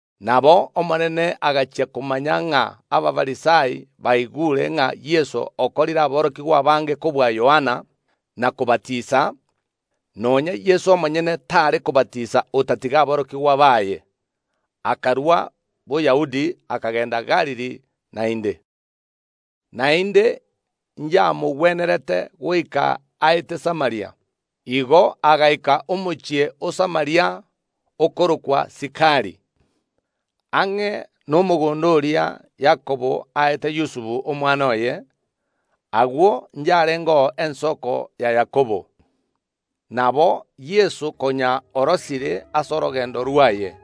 Nabo Omonene agachia komanya ng’a Abafarisai baigure ng’a Yeso okorire aborokigwa abange kobua Yohana, na kobatisa, (nonya Yeso omonyene tare kobatisa, otatiga aborokigwa baye), akarua Boyahudi, akagenda Galili naende. Naende yamogwenerete goika aete Samaria. Igo agaika omochie o Samaria, okorokwa Sikari, ang’e nomogondo oria Yakobo aete Yusufu omwana oye; agwo yarengeo ensoko ya Yakobo. Nabo Yeso, konya orosire ase orogendo rwaye,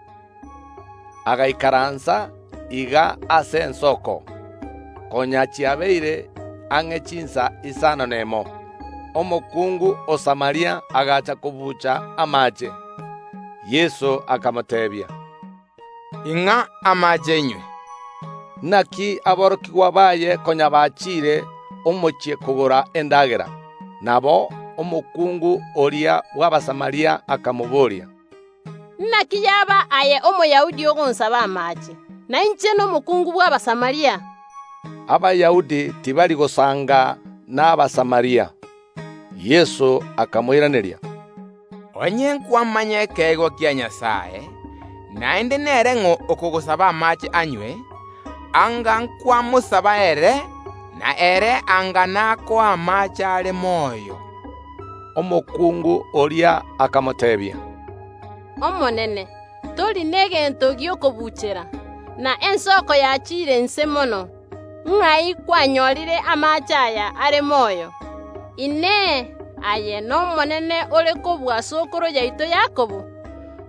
agaikaransa iga ase ensoko. Konya chiabeire ang’e chinsa isano nemo. Omokungu o Samaria agacha kobuucha amaache. Yeso akamoteebia, “Ing’a amaache inywe.” Naki aborokigwa baye konya bachiire omochie kogora endagera. Nabo omokungu oria bw’Abasamaria akamobooria, “Naki yaba aye Omoyahudi ogonsaba amaache, na inche nomokuungu bw’Abasamaria?” (Abayahudi tibari gosanga n’Abasamaria). Yeso akamoiraneria, “Onye nkwamanya ekeegwa kia Nyasae, naende nere ng’o oyo okogosaba amaache anywe, anga nkwamosaba ere, na ere anga nakoa amaache are moyo.” Omokungu oria akamoteebia, “Omonene, tori negento gi’okobuuchera, na ensoko yachiire inse mono; ng’ai kwanyorire amaache aya are moyo? Inee! Aye nomonene ore kobua sokoro yaito Yakobo,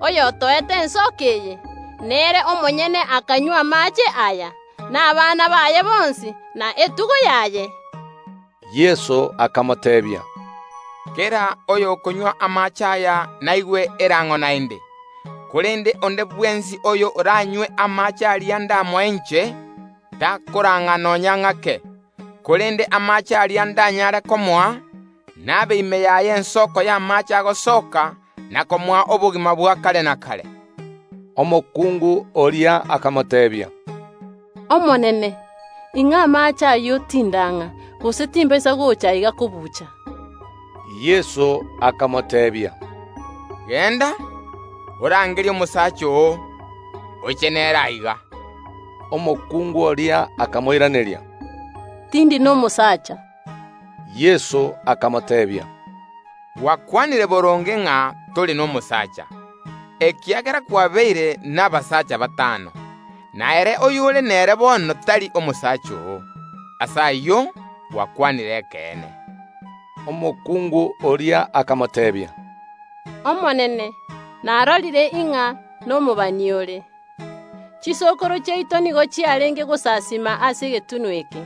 oyotoete ensoko eye, nere omonyene akanywa amaache aya, na abana baye bonsi, na etugo yaye?” Yeso akamoteebia, “Kera oyokonywa amaache aya naigwe erang’o naende; korende onde bwensi oyoranywe amaache aria ndamoe inche, takorang’a nonya ng’ake; korende amaache aria ndanyaare komoa, nabe ime yaye ensoko y’amaache agosoka na komoa obogima bwa kare na kare.” Omokungu oria akamoteebia, “Omonene, ing’a amaache ayio tindang’a, gose timbaisa gocha aiga kobuucha.” Yeso akamoteebia, “Genda, orangerie omosacha oo, oche nere aiga.” Omokungu oria akamoiraneria, “Tindi nomosaacha.” Yeso akamoteebia, “Gwakwanire boronge ng’a tori nomosaacha, ekiagera kwabeire nabasaacha batano, na ere oyore nere bono tari omosacha oo, ase ayio gwakwanire ekeene.” Omokungu oria akamoteebia, “Omonene, narorire ng’a nomobani ore. Chisokoro chiaito nigo chiarenge gosasiima ase egetunwa eke,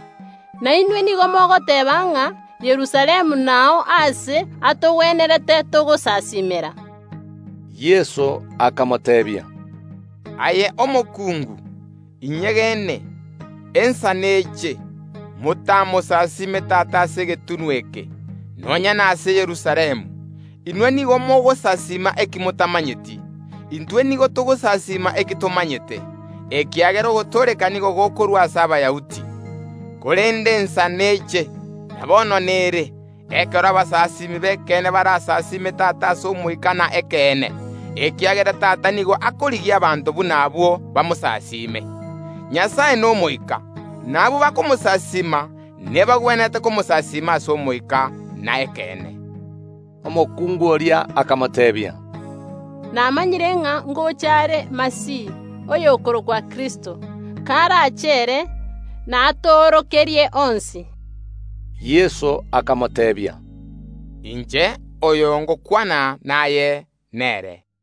na inwe nigo mogoteeba ng’a Yerusalemu nao aase atogwenerete togosasiimera.” Yeso akamoteebia, “Aye omokungu, inyegene, ensa neche, motamosasiime Tata ase egetunwa eke, nonya nase Yerusalemu. Inwe nigo mogosasiima eki motamanyeti; intwe nigo togosasiima eki tomanyete, ekiagera ogotooreka nigo gokorwa ase Abayahudi. Korende ensa neche, na bono nere, ekero abasasiimi b’ekeene barasasiime Tata ase omoika na ekeene, ekiagera Tata nigo akorigia abanto buna abwo bamosasime. Nyasae n’Omoika, na abwo bakomosasiima nebagwenerete komosasiima ase omoika na ekeene.” Omokungu oria akamoteebia, “Namanyire ng’a ngocha are Masihi (oyokorokwa Kristo); karache ere, natoorokerie onsi.” Yeso akamoteebia, “Inche, oyo ngokwana naye, nere.”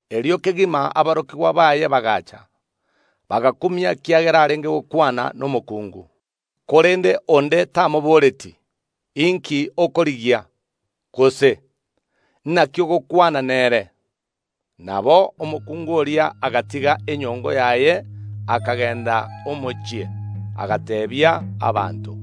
Erio kegima aborokigwa baye bagaacha. Bagakumia ekiagera arenge gokwana nomokuungu; korende onde tamoboretie, “Inki okorigia?” Gose, “Naki ogokwana nere?” Nabo omokungu oria agatiga enyongo yaye, akagenda omochie, agateebia abanto,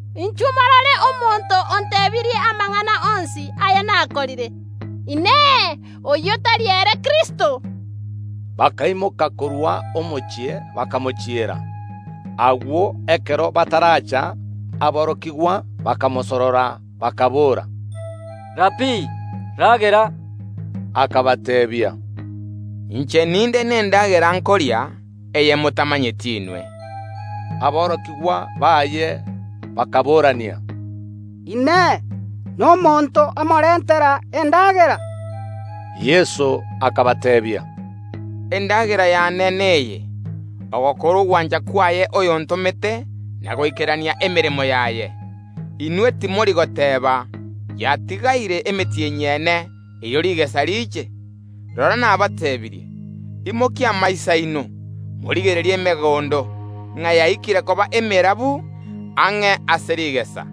“Inchuo, morore omonto ontebirie amang’ana onsi aya nakorire! Inee! Oyio tari ere Kristo?” Bakaimoka korwa omochie, bakamochiera. Agwo ekero bataracha, aborokigwa bakamosorora bakaboora, “Rabii, ragera?” Akabateebia, “Inche ninde nendagera nkoria, eye motamanyeti inwe.” Aborokigwa baye bakaboorania, “Inee! Nomonto omorentera endagera?” Yeso akabateebia, “Endagera yaane neye: ogokora ogwancha kwaye oyontomete na goikerania emeremo yaye. Inwe timori goteeba: Yatigaire emetienyi ene, erio rigesa riiche? Rora nabateebirie: Imokia amaiso aino, morigererie emegondo, ng’a yaikire koba emerabu ang’e ase rigesa.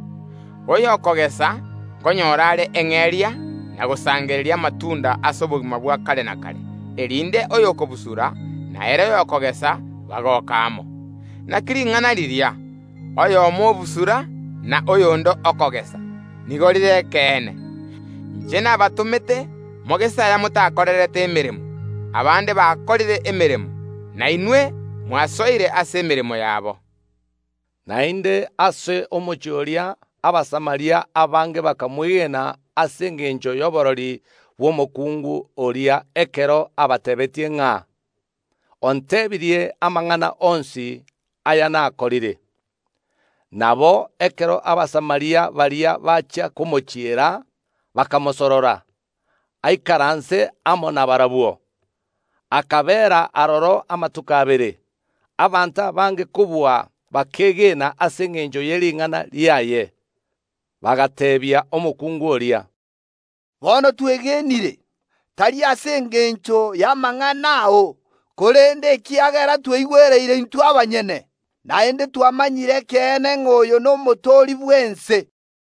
Oyo okogesa nkonyora are eng’eria na gosangereria amatunda ase obogima bwa kare na kare, erinde oyo okobusura na ere oyokogesa bagoke amo. Naki ring’ana riria: Oyomo obusura, na oyonde okogesa, nigo rire ekeene. Inche nabatomete mogese aya motakorerete emeremo; abande bakorire emeremo, na inwe mwasoire ase emeremo yabo.” Naende ase omochie oria Abasamaria abange bakamwegena ase engencho y’oborori bw’omokuungu oria ekero abateebetie ng’a, “Onteebirie amang’ana onsi aya nakorire.” Nabo ekero Abasamaria baria bachia komochiera, bakamosorora aikaranse amo nabarabwo; akabeera aroro amatuko abere. Abanto abange kobua bakeegena ase engencho ye ring’ana riaye; bagateebia omokungu oria, “Bono twegenire, tari ase engencho y’amang’ana ao, korende ekiagera tweigwereire intwe abanyene, naende twamanyire ekeene ng’a oyo n’Omotooria bw’ense.”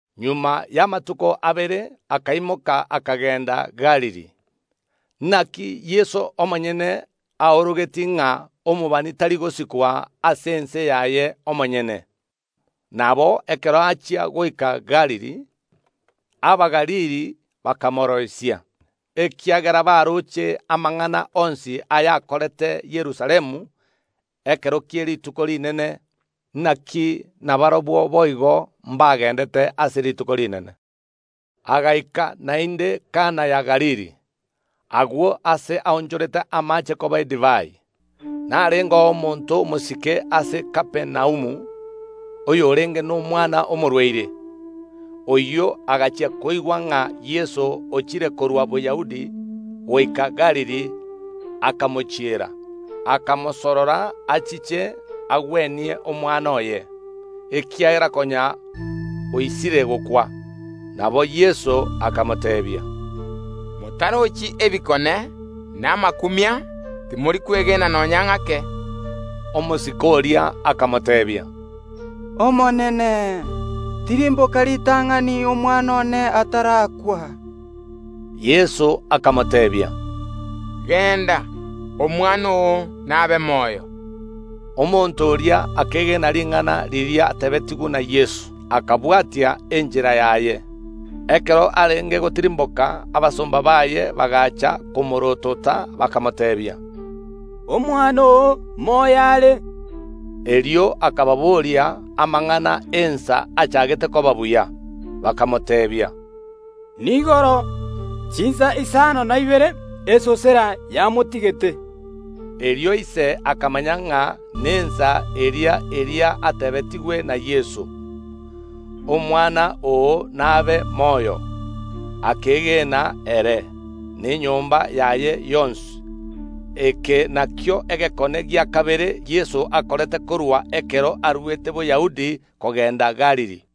Magega y’amatuko abere akaimoka akagenda Galili. Naki Yeso omonyene aorogetie ng’a omobani tari gosikwa ase ense yaye omonyene. Nabo ekero achia goika Galili, Abagalili bakamoroisia, ekiagera baroche amang’ana onsi ayakorete Yerusalemu ekero kie rituko rinene; naki nabarabwo boigo mbagendete ase rituko rinene. Agaika naende Kana ya Galili, agwo ase aonchorete amaache koba edivai. Narengeo omonto omosike ase Kapernaumu, oyorenge n’omwana omorwaire. Oyio agachia koigwa ng’a Yeso ochire korwa Boyahudi goika Galili, akamochiera, akamosorora achiche agwenie omwana oye, ekiagera konya oisire gokwa. Nabo Yeso akamoteebia, “Motarochi ebikone na amakumia, timori kwegena nonya ng’ake.” Omosike oria akamoteebia, “Omonene, tirimboka ritang’ani omwana one atarakwa.” Yeso akamoteebia, “Genda, omwana oo nabe moyo.” Omonto oria akegena ring’ana riria ateebetigwe na Yeso, akabwatia enchera yaye. Ekero arenge gotirimboka abasomba baaye bagaacha komorootota, bakamoteebia, “Omwana oo moyo are.” Erio akababoria amang’ana ensa achaagete koba buya. Bakamoteebia, “Niigoro, chinsa isano na ibere esosera yamotigete.” Erio ise akamanya ng’a nensa eria eria ateebetigwe na Yeso, “Omwana oo nabe moyo!” Akeegena ere, na enyomba yaye yonsi. Eke nakio egekone gia kabere Yeso akorete korwa ekero arwete Boyahudi kogenda Galili.